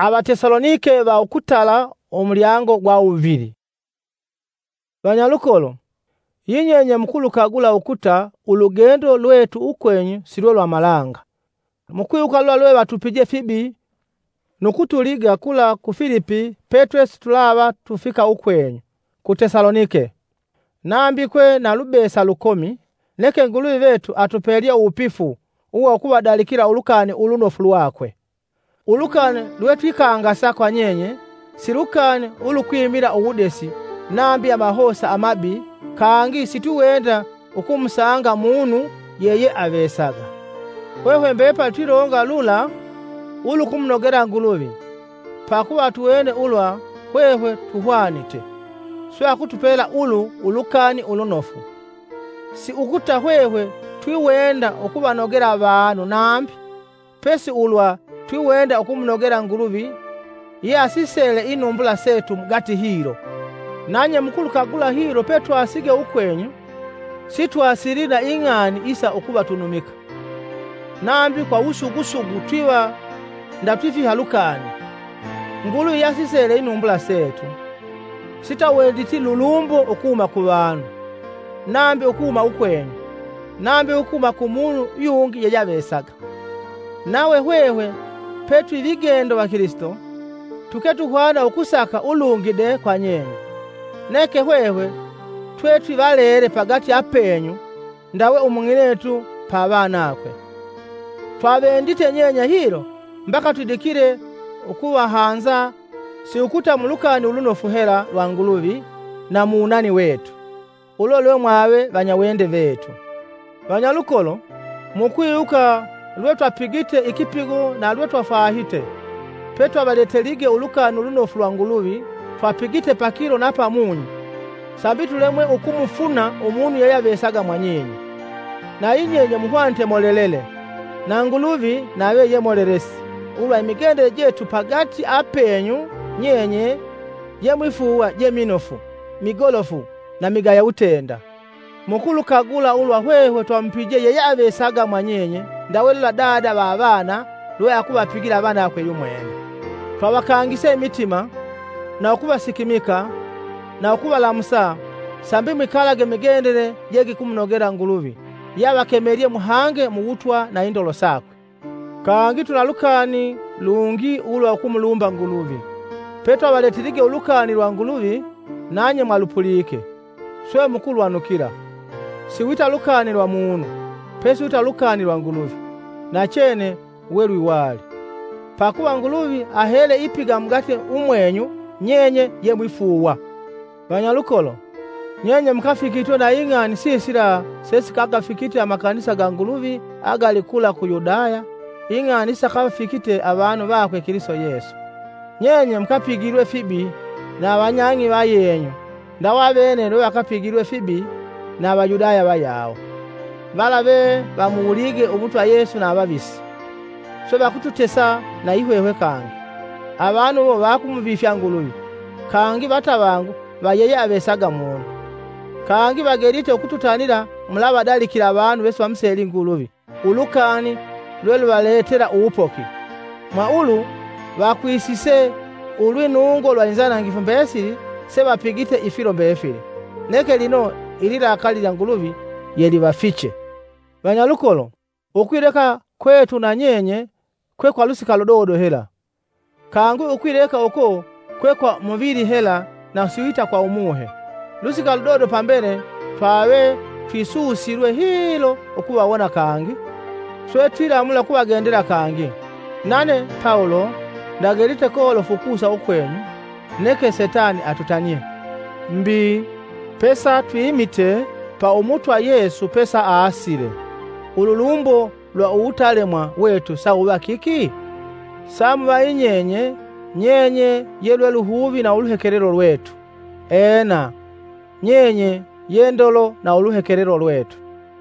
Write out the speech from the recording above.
Uwupisi wa Pawulo ku Tesalonike. Vanyalukolo, yinyenye mukulukagula ukuta ulugendo lwetu ukwenyu si lwe lwa malanga. Mukwiwuka lula lwe vatupije fibi nu kutuliga kula ku Filipi petwesitulava tufika ukwenyu ku Tesaloniki. Nambi kwe na lubesa lukomi, neke Nguluvi vetu atupelye uwupifu uwa ukuvadalikila Ulukani Ulunofu lwakwe. Ulukani lwe twikangasa kwa nyenye si lukani ulukwimila uwudesi nambi amahosa amabi kangi sitwiwenda ukumusanga munu yeyeavesaga. Hwehwe mbepali twilonga lula ulukumunogela Nguluvi pakuva atuwene ulwa hwehwe tuhwanite, swe akutupela ulu Ulukani Ulunofu. Si ukuta hwehwe twiwenda ukuvanogela avanu nambi, pesi ulwa twiwenda ukumunogela Nguluvi ye asisele inumbula setu mugati hilo. Nanye mukulukagula hilo petwasige ukwenyu, sitwasili na ing'ani isa ukuvatunumika, nambi kwa uwusugusugu twiva ndatwifiha lukani, Nguluvi ye asisele inumbula setu! Sitwawenditi lulumbo ukuhuma kuvanu, nambi ukuhuma ukwenyu, nambi ukuhuma ku munu yungi yeyeavesaga, nave hwehwe pe tu vigendo va Kilisito, tuke tuhwana ukusaka ulungi de kwa nyenye. Neke hwehwe twe twi valele pagati apeenyu ndawe umung'inetu pa vanakwe. Twavendite nyenye hilo mbaka twidikile ukuvahanza si ukuta mu Lukani Ulunofu hela lwa Nguluvi na muwunani wetu. Ulo lwe mwave vanyawende vetu! Vanyalukolo, mukwiwuka lwe twapigite ikipigo na lwe twafwahite, pe twavaletelige Ulukani Ulunofu lwa Nguluvi twapigite pakilo na pamunyi sambi tulemwe ukumufuna umunu yeyeavesaga mwa nyenye. Na yinyenye muhwanite molelele, na Nguluvi, nave ye molelesi, ulwa imigendele jetu pagati apeenyu nyenye ye mwifuuwa je minofu, migolofu na migaya wutenda. Mukulukagula ulwa hwehwe twamupije yeyeavesaga mwa nyenye ndawe lula Dada va avana lwe akuvapigila avanakwe yumwene. Twavakangise imitima, na ukusikimika na ukuvalamusa sambi mwikalage mumigendele je gikumunogela Nguluvi ye avakemelye muhange mu wutwa na indolo sakwe. Kangi twina lukani lungi ulwa ukumulumba nguluvi: petwavaletelige ulukani lwa Nguluvi, nanye mwalupulike, swe mukulwanukila, si wita lukani lwa munu, pesi wita lukani lwa Nguluvi, nachenne welwiwali. Pakuva Nguluvi ahele ipiga mugati umwenyu nyenye ye mwifuuwa. Vanyalukolo, nyenye mukafikitwe na ing'ani sisila sesikagafikite amakanisa ga Nguluvi agali kula ku Yudaya, ing'ani isikavafikite avanu vakwe Kilisito Yesu. Nyenye mukapigilwe fibi na avanyang'i vayenyu ndawe avene lwe vakapigilwe fibi na Avayudaya vayawo, vala ve vamuwulige Umutwa Yesu na avavisi, swe vakututesa na yihwehwe kangi. Avanu iwo vakumuvifya Nguluvi, kangi vatavangu va yeyeavesaga munu! Kangi vagelite ukututanila mulava vadalikila avanu vesivamuseli Nguluvi ulukani lwe luvaletela uwupoki. Mwa Ulu vakwisise ulwinungo lwa inzanangifu mbesili sevapigite ifilo mbefili. Neke lino ililakali lya Nguluvi yelivafiche. Vanyalukolo, ukwileka kwetu na nyenye kwe kwa lusika ludodo hela, kangi ukwileka uko kwe kwa muvili hela na siwita kwa Umuhe. Lusika ludodo pambele, twave twisusilwe hilo ukuvawona kangi! Swe twilamula ukuvagendela kangi. Nane, Pawulo, ndagelite kolofu ukusa ukwenyu, neke Setani atutanie. Mbi, pesatwimite pa Umutwa Yesu pesaasile, ululumbo lwa uwutalemwa wetu sawuva kiki? Samuva yinyenye; nyenye ye lwe luhuvi na uluhekelelo lwetu! Ena, nyenye ye ndolo na uluhekelelo lwetu!